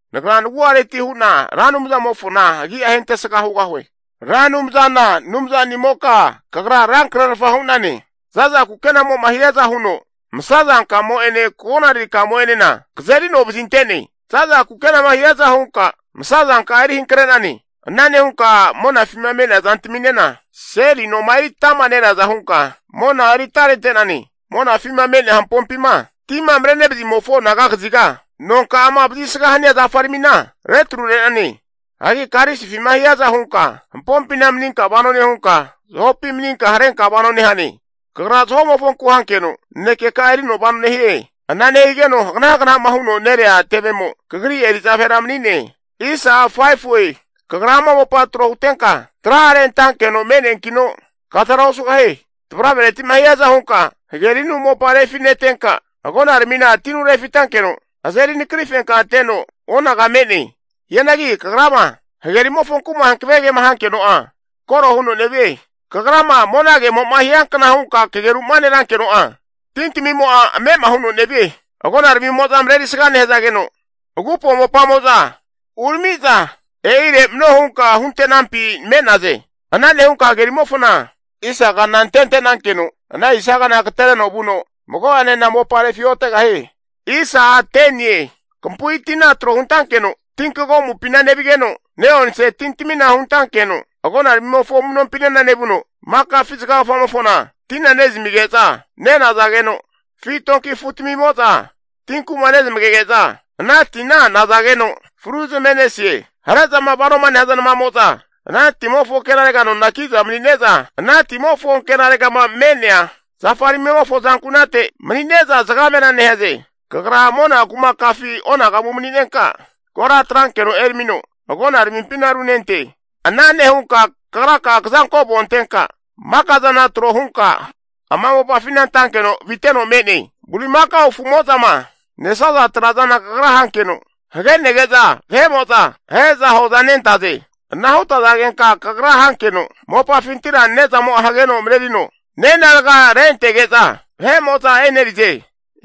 Nagra nagu'areti hu'na Ra Anumzamofona agi'a ahentesga hugahue. Ra Anumzana Anumzanimoka kagra rankrerfa hu'nane. Za'za kukenamo'ma hiaza huno masa zankamo'ene konaririkamo'enena kazerino vazinte'ne. Za'za kukenama hiaza hunka masa zanka'a eri hankre'nane. Ana nehunka monafima me'nea zantaminena, seli noma eri atama nereaza hunka, mona eri atarente'nane. Monafima me'nea hampompima tima marenevazimofo anaga kaziga, nonka'ama vazisga hania zafaramina retrure'nane. Hagi karisifima hiaza hunka hampompina maninka vano nehunka, zahopi maninka harenka vano nehane. Kagra zaho'mofonku hankeno nanekeka'a erino vano nehie. Ana nehigeno hagna hagna'ma huno nerea tevemo, Kagri eri'za vahera mani'ne. Kagra ama mopa tro hutenka tra'are antankeno me'neankino kazara osugahie. Tavravereti'ma hiaza hunka hagerinu mopa refi'netenka, agonaramina tinu refitankeno azeri nakari fenkateno onaga me'ne. Hianagi kagrama hage rimofonku'ma hankave kema hankeno'a, koro huno nevie. Kagrama monagemo'ma hiankna hunka kageru'ma nerankeno'a, tintamimo'a ame'ama huno nevie. Agonaramimo'za marerisga nehzageno, agupo mopamo'za uramiza e'ire mano hunka hunte'nampi me'naze. Ana nehunka hagerimofona, isa kana antetenankeno ana isa kana agatereno vuno mago'anena mopa refi'otegahie. Kampu'i tina tro huntankeno, tinkagomupina nevigeno, ne'onse tintamina huntankeno agonaramimofo amu'nompinena nevuno, maka afizaga gafamofona tina nezamige'za nenazageno, afi donki afu'tamimo'za tinku'ma nezmagege'za ana tina nazageno fru zame'nesie. Hare'zama vanoma nehaza namamo'za ana timofo ankenarega nona ki'za manine'za, ana timofo ankenaregama me'nea zafaramimofo azankunate manine'za zagamera nehaze. Kagra mona kumakafi onagamu mani'nenka, kora atrankeno eramino agona ramimpina runente. Ana nehunka kagraka'a kazanko avona antenka, maka zana tro hunka ama mopafina antankeno aviteno me'ne. Bulimakao afu'mo'zama nesaza trazana kagra hankeno hagenege'za vahe'mo'za ahe'za hoza nentaze. Ana hutazagenka kagra hankeno, mopafintira ne'zamo'a hageno marerino nenarga rentege'za vahe'mo'za e'nerize.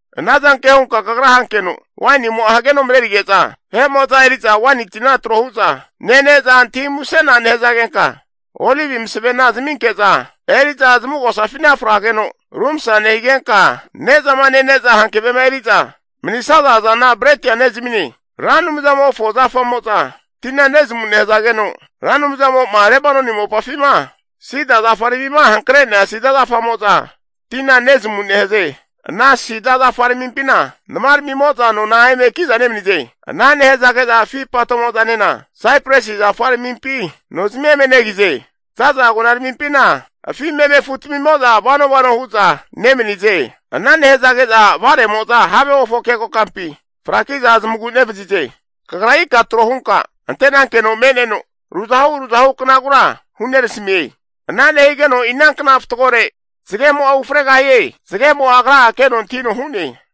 Anazanke hunka kagra hankeno wainimo'a hageno marerige'za, eri'za waini tina tro hu'za nene'za antahi musena nehazagenka, olivi masavena zaminke'za eri'za zamugosafina frageno rumsa nehigenka, ne'zama nene'za hankavema eri'za manisaza zana bretia nezamine. Ra Anumzamofo zafamo'za tina nezamu nehazageno, Ra Anumzamo'ma Lebanoni mopafima sida zafaramima hankre'nea sida zafamo'za tina nezamu nehaze. Ana sida zafa ramimpina nama ramimo'za nona eme ki'za nemanize. Ana nehazage'za afi patomo'zanena (stork) saipresi zafa ramimpi nozamia eme negize. Za'za agona ramimpima nemaniza afi meme afutamimo'za vano vano hu'za nemanize. Ana nehazage'za vare'mo'za havemofo keko kampi fraki'za zamagu nevazize. Kagra ika tro hunka ante'nankeno me'neno, ruzahu ruzahu knagura hunerasamie. Ana nehigeno inankna fatgore zagemo'a ufregahie zagemo'a agra'a keno antahino hu'ne.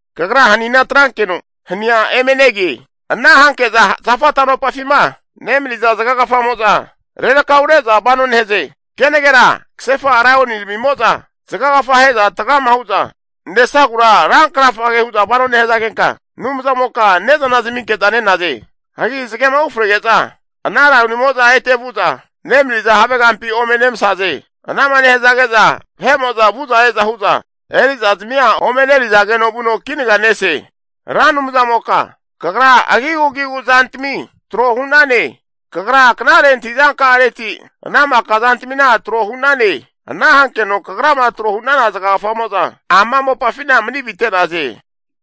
Kagra hanina atrankeno hania eme negie. Ana hanke'za zafa tano'pafima nemaniza zagagafamo'za rerakaure'za vano nehaze. Kenagera kasefa laioni ramimo'za zagagafama ahe'za tragama hu'za nesagura rankrafage hu'za vano nehazagenka, Anumzamoka ne'zana zaminke'za nenaze. Hagi zagema ufrege'za ana laionimo'za ete vu'za nemaniza have kampi ome nemasaze. Ana'ma nehazage'za vahe'mo'za vu'za e'za hu'za eri'za zamia ome e'nerizageno vuno kinaga nese. Ra Anumzamoka, kagra agigu agigu zantami tro hu'nane. Kagra knare antahi'za ka'areti ana maka zantamina tro hu'nane. Ana hankeno Kagrama tro hu'nana zagagafamo'za ama mopafina mani avite'naze.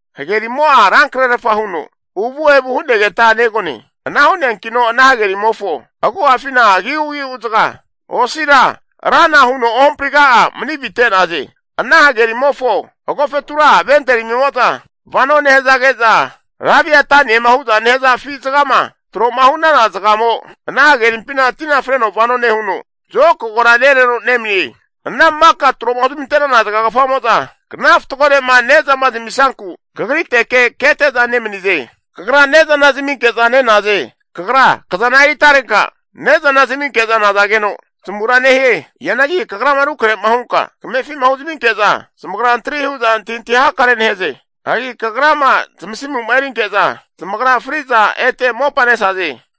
Hagerimo'a rankrerfa huno uvu evu hu'negeta negone. Ana hu'neankino ana hagerimofo agu'afina agigu agigu zaga, osira rana huno ohampriga'a mani avite'naze. Ana hagerimofo agofetura venteramimo'za vano nehazage'za, Laviataniema hu'za nehaza afi zagama, tro'ma hu'nana zagamo ana hagerimpina tina freno vano nehuno zokagora nereno nemanie. Ana maka tro'ma huzmante'nana zagagafamo'za, kna fatgore'ma ne'zama zamisnanku kagriteke kete'za nemanize. Kagra ne'zana zaminke'za nenaze. Kagra kazana eri atarenka ne'zana zaminke'za nazageno zamura nehie. Hianagi Kagrama rukrahe'ma hunka kamefi'ma huzaminke'za, zamagra antri hu'za antahintahi hakare nehaze. Hagi Kagrama zamasimu'ma erinke'za, zamagra fri'za ete mopanesaze.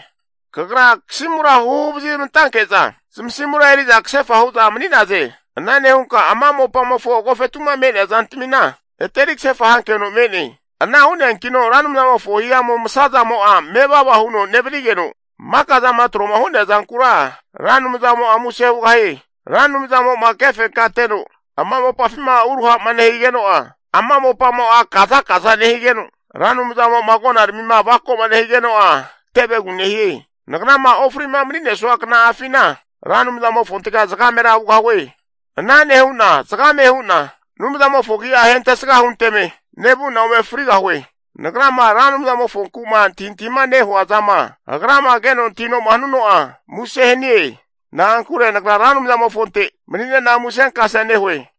Kagra kasimura huhu huvazi zamantanke'za, zamasimura eri'za kasefa hu'za mani'naze. Ana nehunka maka ama mopamofo agofetu'ma me'nea zantamina, ete eri kasefa hankeno me'ne. Ana hu'neankino Ra Anumzamofo hihamu masazamo'a mevava huno nevanigeno, maka zama tro'ma hu'nea zankura Ra Anumzamo'a muse hugahie. Ra Anumzamo'ma kefenkateno ama mopafima uruha'ma nehigeno'a, ama mopamo'a kazakaza nehigeno, Ra Anumzamo'ma agona ramima avako'ma nehigeno'a tevegu nehie. Nagrama ofri'ma mani'nesua kna'afina, Ra Anumzamofontega zagamera hugahue. Ana nehu'na zagame hu'na Anumzamofo agi'a ahentesga hunteme nevu'na ome frigahue. Nagrama Ra Anumzamofonku'ma antahintahima nehua zama Agrama keno antahino'ma hanuno'a muse hanie. Na'ankure nagra Ra Anumzamofonte mani'nena musenkasea nehue.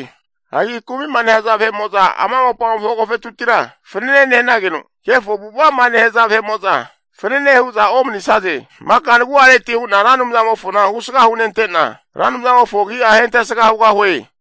Hagi kumi'ma nehaza vahe'mo'za ama mopamofo agofetutira fanene nehanageno, kefo avu'ava'ma nehaza vahe'mo'za fanane hu'za omanisaze. Maka nagu'areti hu'na Ra Anumzamofona husga hunente'na, Ra Anumzamofo agi'a ahentesga hugahue.